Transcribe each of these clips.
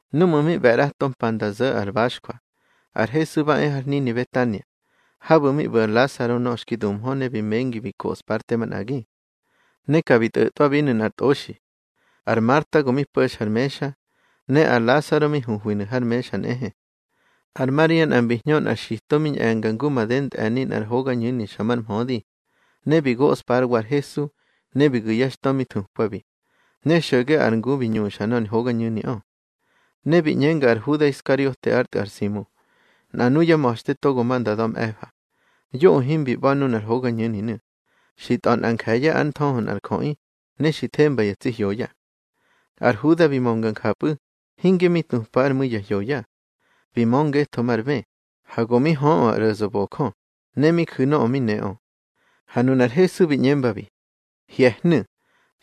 Núꞌmu̱ mi ꞌbe̱ ꞌrato mpa nda zo̱ ar baxjwa, ar Hesu ba e har hnini Betania, habu̱ mi ꞌbu̱ ar Lasaro nöꞌö xki duhmö ne bi mengi bi koꞌspa ár te manꞌagi. Ne ka bi tꞌo̱tꞌwabinu̱ nꞌar tꞌoxi. Ar Marta go mi po̱xa ar mexa, ne ar Lasaro mi huhwinu̱ har mexa nꞌehe. Ar Maria nꞌa mbi hñö nꞌar xito, mi ñꞌe̱nga ngu made ntꞌe̱ni nꞌar hogañu̱ni xa mar mhödi, ne bi goꞌspa ár wa ar Hesu. Ne bi gu̱ yá xtö mi thukwabi, ne xo̱ge ar ngu bi ñuxa nor hogañu̱niꞌö. Ne bi ꞌñenga ar Huda Iskariote ár tꞌu̱ ar Simu, nꞌa nuyá ma̱xte togo ma nda da̱ mꞌe̱fa: —Yoꞌö himbi ꞌba̱ nunar hogañu̱ninu̱, xi tꞌa̱ nꞌa nje̱ye̱ ár nthöhö nꞌar jöꞌi, ne xi themba ya tsi hyoya. Ar Huda bi mönga njapꞌu̱, hinge mi tupa ár mu̱i ya hyoya. Bi mö ngetho már bë, ha go mi höꞌö ar ꞌro̱zöbojö, ne mi ju̱ nöꞌö mi neꞌö. Ha nunar Hesu bi ꞌñembabi: —Hye̱hnu̱.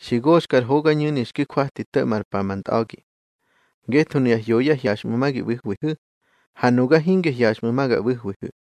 Xi goxka ar hogañu̱ni xki kwati to̱ꞌma ár pa ma ntꞌa̱gi. Ngetho nuya hyoya hyaxꞌmu̱ ma gi ꞌbu̱hwihu̱, ha nuga hinge hyaxꞌmu̱ ma ga ꞌbu̱hwihu̱.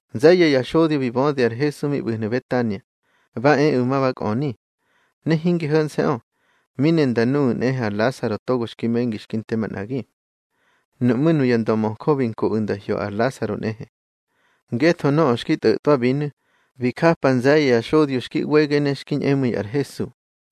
Nze̱ye̱ ya xodyo bi bödi ar Hesu mi ꞌbu̱hnu̱ Betania, ba eꞌu̱ ma ba kꞌöni. Ne hinge ho̱nse̱ꞌö, mi ne nda nuꞌu̱ nꞌehe ar Lasaro togo xki mengi xki nte manꞌagi. Nuꞌmú̱ nuya ndömöjö bi nkoꞌu̱ nda hyo ar Lasaro nꞌehe. Ngetho nöꞌö xki tꞌo̱tꞌwabinu̱, bi japa nze̱ye̱ ya xodyo xki ꞌwege ne xki ñꞌemu̱i ar Hesu.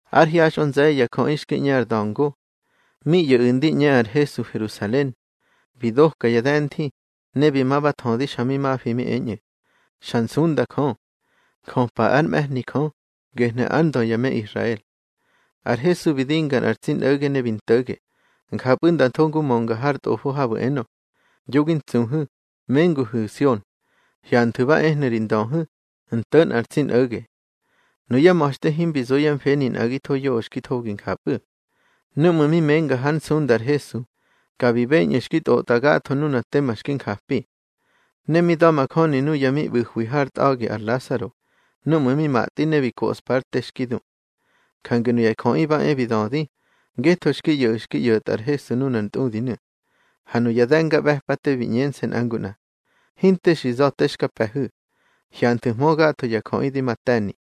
Ár hyaxꞌö nze̱ye̱ ya jöꞌi xki ꞌñe ar da̱ngo. Mi ꞌyo̱ꞌu̱ ndi ꞌñe ar Hesu Herusalen, bi doka ya de̱nthi, ne bi ma ba thödi xa mi mafi mi eñꞌu̱: —Xa nsunda Jö. Njöpa ár mꞌe̱hni Jö, gehnu̱ ár ndö ya me Israel. Ar Hesu bi dinga nꞌar tsi nꞌo̱ge ne bi nto̱ge, njapꞌu̱ nda tho ngu mönga har Tꞌofo habu̱ enö: Yo gi ntsuhu̱, menguhu̱ Sion; hyanthu̱ ba ehnu̱ ri Ndöhu̱, nto̱ nꞌar tsi nꞌo̱ge. Nuyá ma̱xte himbi zo yá mfeni nꞌagitho yoꞌö xki thogi njapꞌu̱. Núꞌmu̱ mi menga hár nsunda ar Hesu, ka bi beñꞌu̱ xki tꞌotꞌa gatho nuna tema xki njapi. Ne mi da̱majöni nuya mi ꞌbu̱hwi hár tꞌa̱gi ar Lasaro, núꞌmu̱ mi matꞌi ne bi koꞌspa ár te xki du. Jange nuya jöꞌi ba e bi dödi, ngetho xki ꞌyo̱ꞌu̱ xki ꞌyo̱tꞌa ar Hesu nunar ntꞌudinu̱. Ha nuya de̱ngaꞌbe̱pate bi ꞌñense̱ nꞌa ngu nꞌa: —Hinte xi za̱ te xka pe̱hu̱. Hyanthu̱hmö gatho ya jöꞌi di ma te̱ni.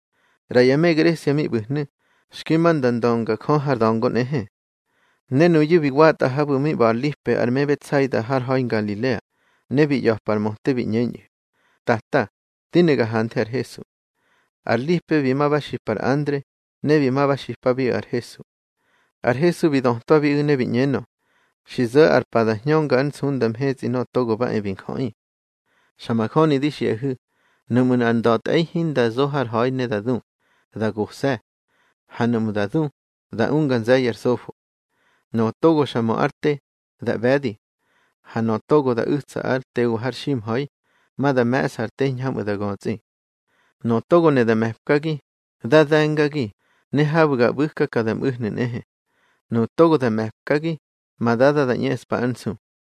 ꞌRa ya me Gresia mi ꞌbu̱hnu̱, xki ma nda ndönga Jö har da̱ngo nꞌehe. Ne nuyu̱ bi watꞌa habu̱ mi ꞌba̱ ar Lipe ar me Betsaida har ha̱i Ngalilea, ne bi ꞌya̱pa ar möte bi ꞌñeñꞌu̱: —Tata, di ne ga hanthe ar Hesu. Ar Lipe bi ma ba xipa ar Andre, ne bi ma ba xipabiꞌu̱ ar Hesu. Ar Hesu bi dötwabiꞌu̱ ne bi ꞌñenö: —Xi zo̱ ar pa da hñönga ár nsunda mhetsꞌi Nöꞌö Togo ba e bi Njöꞌi. Xa majöni di xiꞌahu̱, nuꞌmu̱ nꞌar nda̱tꞌe̱i hinda zo har hwöhi ne da du, da gose̱. Ha nuꞌmu̱ da du, da unga nze̱ye̱ ar sofo. Nöꞌö togo xa mö ár te, da ꞌbe̱di. Ha nöꞌö togo da u̱tsa ár tewa har ximha̱i, ma da me̱ꞌsa ar te hiñhamꞌu̱ da götsꞌi. Nöꞌö togo ne da me̱pkagi, dá de̱ngagi, ne habu̱ ga ꞌbu̱ka ka da mꞌu̱hnu̱ nꞌehe. Nuꞌu̱ togo da me̱pkagi, ma Dada da ꞌñeꞌspa ár nsu.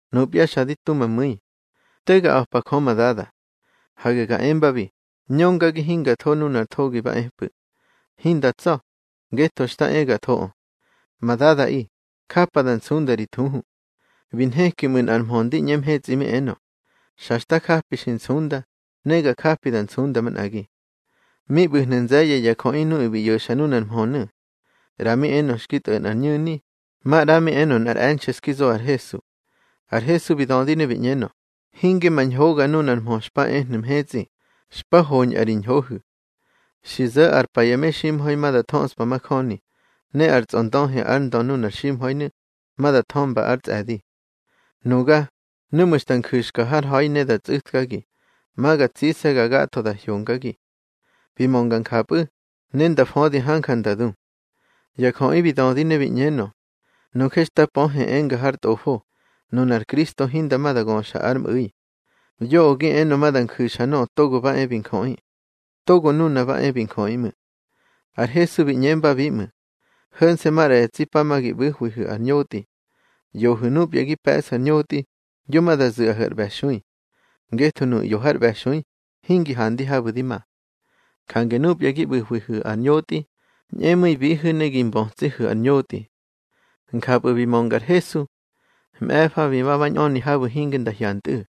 Nupya xa di tu ma mu̱i. Te ga a̱pa Jö ma Dada. Hage ga embabi: Ñöngagi hinga tho nunar thogi ba epꞌu̱. Hinda tsa̱, ngetho xta e ga thoꞌö. Ma Dadaꞌi, japa da nsunda ri thuhu. Bi nheki ꞌmu̱ nꞌar mhö ndi ꞌñe mhetsꞌi mi enö: —Xa xta japi xi nsunda, ne ga japi da nsunda manꞌagi. Mi ꞌbu̱hnu̱ nze̱ye̱ ya jöꞌi nuꞌu̱ bi ꞌyo̱xa nunar mhönu̱. ꞌRa mi enö xki tꞌo̱ nꞌar ñu̱ni, maꞌra mi enö nꞌar e̱nxe̱ xki zo ar Hesu. Ar Hesu bi dödi ne bi ꞌñenö: —Hinge ma ñhoga nunar mhö xpa ehnu̱ mhetsꞌi, xpa hoñꞌa ri ñhohu̱. Xi zo̱ ar pa ya meximha̱i ma da thöꞌspa majöni, ne ar tsꞌondöhi ár ndö nunar ximha̱inu̱, ma da thömba ár tsꞌe̱di. Nuga, núꞌmu̱ xta nju̱xka har ha̱i ne da tsꞌu̱tkagi, ma ga tsigase̱ gatho da hyongagi. Bi mönga njapꞌu̱, ne nda födi hanja nda du. Ya jöꞌi bi dödi ne bi ꞌñenö: —Nuje xta pöhe enga har tꞌofo, nunar Kristo hinda ma da göxa ár mꞌu̱i. Yoꞌö gi enö ma da nju̱xa Nöꞌö Togo ba e bi Njöꞌi. Togo Nuna ba e bi Njöꞌi ꞌmu̱. Ar Hesu bi ꞌñembabi ꞌmu̱: —Ho̱nse̱ maꞌra ya tsi pa ma gi ꞌbu̱hwihu̱ ar ñotꞌi. ꞌYohu̱ núpya gi pe̱ꞌsu̱ ar ñotꞌi, yo ma da zu̱ꞌahu̱ ar ꞌbe̱xui. Ngetho nuꞌu̱ ꞌyo har ꞌbe̱xui hingi handi habu̱ di ma. Jange núpya gi ꞌbu̱hwihu̱ ar ñotꞌi, ñꞌemu̱ibihu̱ ne gi mbötsihu̱ ar ñotꞌi. Njapꞌu̱ bi mönga ar Hesu. Mꞌe̱fa bi ma ba ñꞌöni habu̱ hinge nda hyantꞌu̱.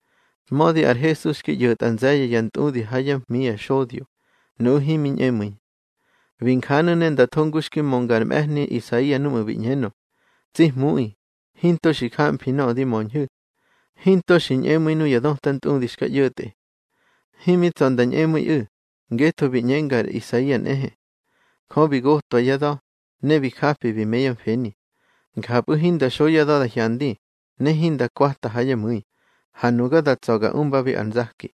Mödi ar Hesu xki ꞌyo̱tꞌa nze̱ye̱ ya ntꞌudi ha yá hmi ya xodyo, nuꞌu̱ himi ñꞌemu̱i. Bi njanu̱ ne nda tho ngu xki mönga ar mꞌe̱hni Isaia núꞌmu̱ bi ꞌñenö: Tsi Hmuꞌi, hinto xi jamfi nöꞌö di möñhu̱. Hinto xi ñꞌemu̱i nuya döta ntꞌudi xka ꞌyo̱tꞌe. Himi tsa̱ nda ñꞌemu̱iꞌu̱, ngetho bi ꞌñenga ar Isaia nꞌehe: Jö bi gotwa yá da̱, ne bi japi bi me yá mfeni, Njapꞌu̱ hinda xo yá da̱ da hyandi, ne hinda kwata ha yá mu̱i, ha nuga da tsa̱ ga umba ar nzaki.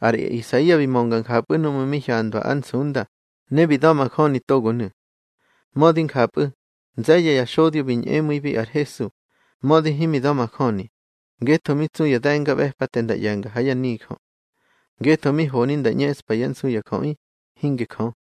Ar Isaia bi mönga njapꞌu̱ núꞌmu̱ mi hyandwa ár nsunda, ne bi da̱majöni togonu̱. Mödi njapꞌu̱, nze̱ye̱ ya xodyo bi ñꞌemu̱ibi ar Hesu, mödi himi da̱majöni, ngetho mi tsu ya de̱ngaꞌbe̱pate nda ꞌye̱nga ha yá nijö. Ngetho mi honi nda ꞌñeꞌspa yá nsu ya jöꞌi, hinge Jö.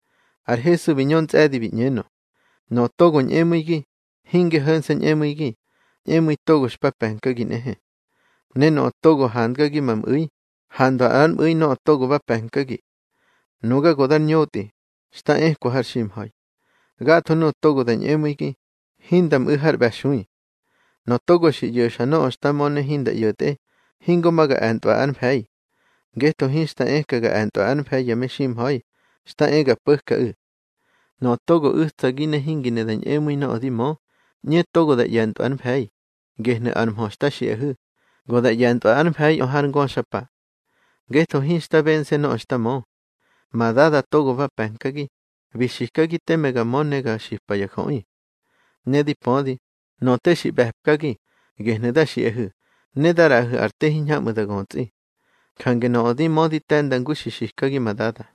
Ar Hesu bi ñö ntsꞌe̱di bi ꞌñenö: —Nöꞌö togo ñꞌemu̱igi, hinge ho̱nse̱ ñꞌemu̱igi, ñꞌemu̱i togo xpa pe̱nkagi nꞌehe. Ne nöꞌö togo handgagi ma mꞌu̱i, handwa ár mꞌu̱i nöꞌö togo ba pe̱nkagi. Nuga go dar ñotꞌi, xta ekwa har ximha̱i. Gatho nuꞌu̱ togo da ñꞌemu̱igi, hinda mꞌu̱ har ꞌbe̱xui. Nöꞌö togo xi ꞌyo̱xa nöꞌö xta mö ne hinda ꞌyo̱tꞌe, hingo ma ga e̱ntꞌwa ár mfe̱i. Ngetho hinxta eka ga e̱ntꞌwa ár mfe̱i ya meximha̱i, xta e ga po̱kaꞌu̱. Nöꞌö togo u̱tsagi ne hingi ne da ñꞌemu̱i nöꞌö di mö, ꞌñe togo da ꞌye̱ntꞌwa ár mfe̱i, gehnu̱ ar mhö xta xiꞌahu̱, go da ꞌye̱ntꞌwa ár mfe̱iꞌö har ngöxapa. Ngetho hinxta bense̱ nöꞌö xta mö. Ma Dada togo ba pe̱nkagi, bi xikagi teme ga mö ne ga xipa ya jöꞌi. Ne di pödi, nöꞌö te xi ꞌbe̱pkagi, gehnu̱ da xiꞌahu̱, ne da ꞌraꞌahu̱ ar te hiñhamꞌu̱ da götsꞌi. Jange nöꞌö di mö di te̱nda ngu xi xikagi ma Dada.